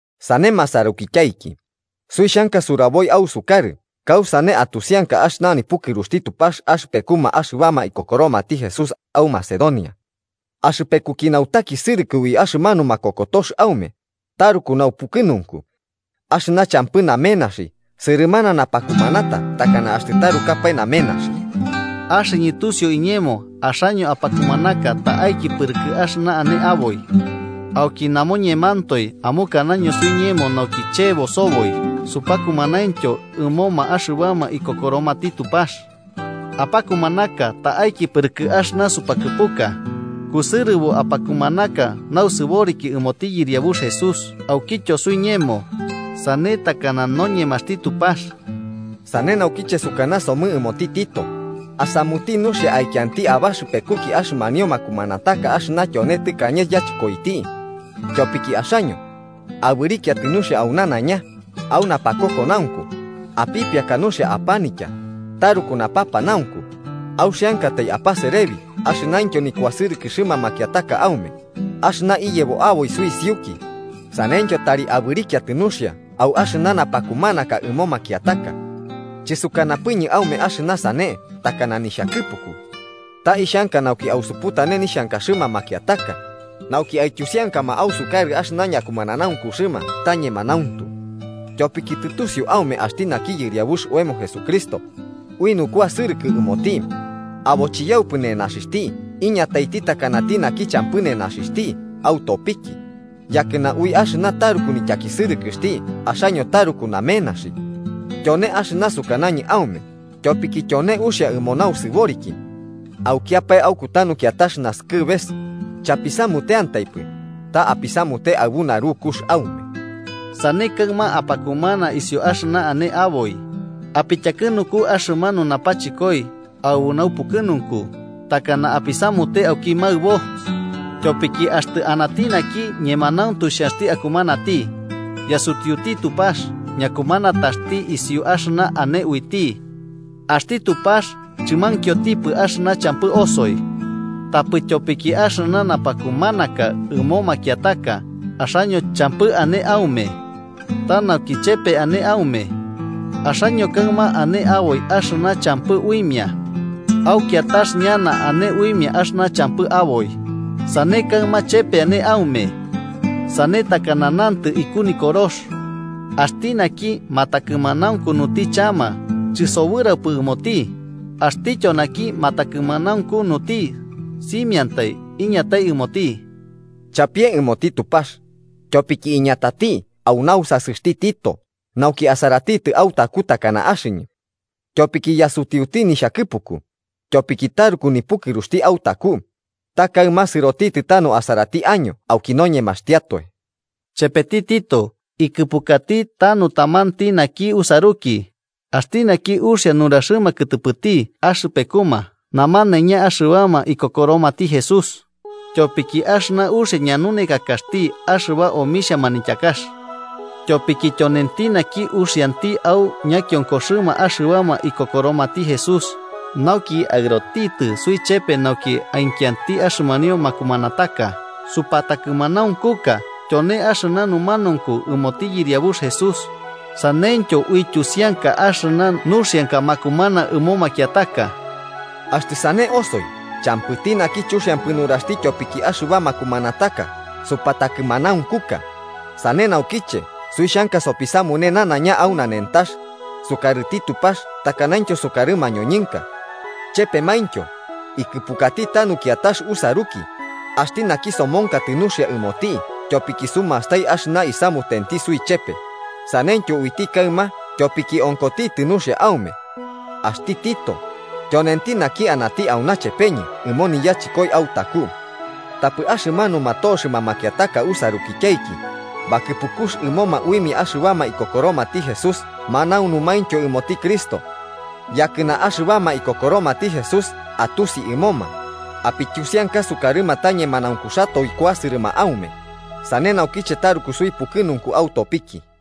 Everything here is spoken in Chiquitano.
Sane masarukityaiki, suixhanka suburaboi ausukarɨ kausane atusianka axɨna nipukɨruxti Tupax axɨpekuma axɨbama ikokoromati Jesús au Macedonia. Axɨpekuki nautakisɨrɨkɨ ui axɨmanu makokotox aume, taruku naupukɨnunku. Axɨna champɨ namenaxi, sɨrɨmana napakumanata takana axtɨ tarukapae namenaxi. Axɨñɨ tusiu iñemo axaño apakumanaka ta'aiki pɨrɨkɨ axɨna ane aboi. Auki namoñemantoe amukanaño suiñemo nauki chebo soboi supakumanaintyo ɨmoma axɨbama ikokoromati Tupax. Apakumanaka ta'aiki pɨrɨkɨ axɨna supakɨpuka, kusɨrɨbo apakumanaka nausɨboriki ɨmoti Yɨriabux Jesús aukityo suiñemo, sane takana noñemaxti Tupax. Sane naukiche sukanasomɨ ɨmoti Tito asamuti nuxia aikianti abaxɨpekuki axɨmanio makumanataka axɨna tyone tɨkañe yachɨkoiti. Tyopiki axaño, abɨrikiatɨ nuxia au nanaiña: au napakokonaunku, apipiaka nuxia apanitya, taruku napapanaunku, auxiankatai apaserebi axɨnaintyo nikuasɨrɨkɨxɨma makiataka aume axɨna iyebo aboi suisiuki, saneityo tari abɨrikiatɨ nuxia au axɨna napakumanaka ɨmo makiataka. Chɨsukanapɨñɨ aume axɨna sane takana nixhakɨpuku. Ta ixhanka nauki ausuputane nixhankaxɨma makiataka, nauki aityusiankama ausukarɨ axɨna ñakumananaunkuxɨma ta ñemanauntu. Tyopiki tɨtusiu aume axti naki Yɨriabux oemo Jesucristo, ui nukuasɨrɨkɨ ɨmoti, abo chiyaupɨ nenaxixhti iñatati takanati naki champɨ nenaxixhti autopiki, yakɨna ui axɨna taruku nityakisɨrɨkɨxti axaño taruku namenaxi. Tyone axɨna sukanañɨ aume tyopiki tyone uxia ɨmo nausɨboriki. Aukiapae au kutanu kiatax nasɨkɨbes, chapisamuteantaipɨ, ta apisamute aɨbu narukux aume. Sane kaɨma, apakumana isiu axɨna ane aboi, apityakɨnuku axɨmanu napachɨkoi aɨbu naupukɨnunku takana apisamute auki maɨbo. Tyopiki axtɨ anati naki ñemanauntu xhanxti akumanati, yasutiuti Tupax ñakumanataxti isiu axɨna ane uiti. Axti Tupax chɨmankiotipɨ axɨna champɨ osoi. Tapɨ tyopiki axɨna napakumanaka ɨmo makiataka axaño champɨ ane aume. Ta nauki chepe ane aume. Axaño kaɨma ane aboi axɨna champɨ uimia. Au kiatax ñana ane uimia axɨna champɨ aboi, sane kaɨma chepe ane aume. Sane takana nantɨ iku Nikorox: “Axti naki matakɨmanaukunuti chama chɨsobɨraupɨ ɨmoti, axtityo naki matakɨmanaunkunuti simiantai iñatai ɨmoti.” Chapie ɨmoti Tupax, tyopiki iñatati au nausasɨxti Tito nauki asaratitɨ autaku takana axɨñɨ. Tyopiki yasutiuti nixhakɨpuku, tyopiki taruku nipukɨruxti autaku, ta kaɨma sɨrotitɨ tanu asarati año auki noñemaxtiatoe. Chepeti Tito, ikɨpukati tanu tamanti naki usaruki, axti naki uxia nuraxɨma kɨtɨpɨti axɨpekuma namanaiña axɨbama ikokoromati Jesús, tyopiki axɨna uxia ñanunekakaxti axɨba omixhia manityakax. Tyopiki tyonenti naki uxianti au ñakionkoxɨma axɨbama ikokoromati Jesús nauki aɨrotitɨ suichepe nauki aikianti axɨmanio makumanataka supatakɨmanaunkuka tyone axɨna numanaunku ɨmoti Yɨriabux Jesús saneityo uityusianka axɨna nuxianka makumana ɨmo makiataka. Axtɨ sane osoi champɨti naki chuxiampɨ nuraxti tyopiki axɨba makumanataka supatakɨmanaunkuka, sane naukiche suixhanka sopisamune nanaiña au nanentax, sukarɨti Tupax takanaintyo sukarɨ mañoñɨnka. Chepemaintyo, ikɨpukati tanu kiatax usaruki, axti naki somonkatɨ nuxia ɨmoti tyopiki sumastai axɨna isamutenti suichepe, saneityo uiti kaɨma tyopiki onkotitɨ nuxia aume. Axti Tito, tyonenti naki anati auna chepeñɨ ɨmo niyachɨkoi autaku. Tapɨ axɨmanuma toxɨma makiataka usarukityaiki, bakɨpukux ɨmoma uimia axɨbama ikokoromati Jesús manaunumaintyo ɨmoti Cristo. Yakɨna axɨbama ikokoromati Jesús atusi ɨmoma, apityusianka sukarɨma ta ñemanaunkuxatoe kuasɨrɨma aume, sane naukiche taruku suipukɨnunku autopiki.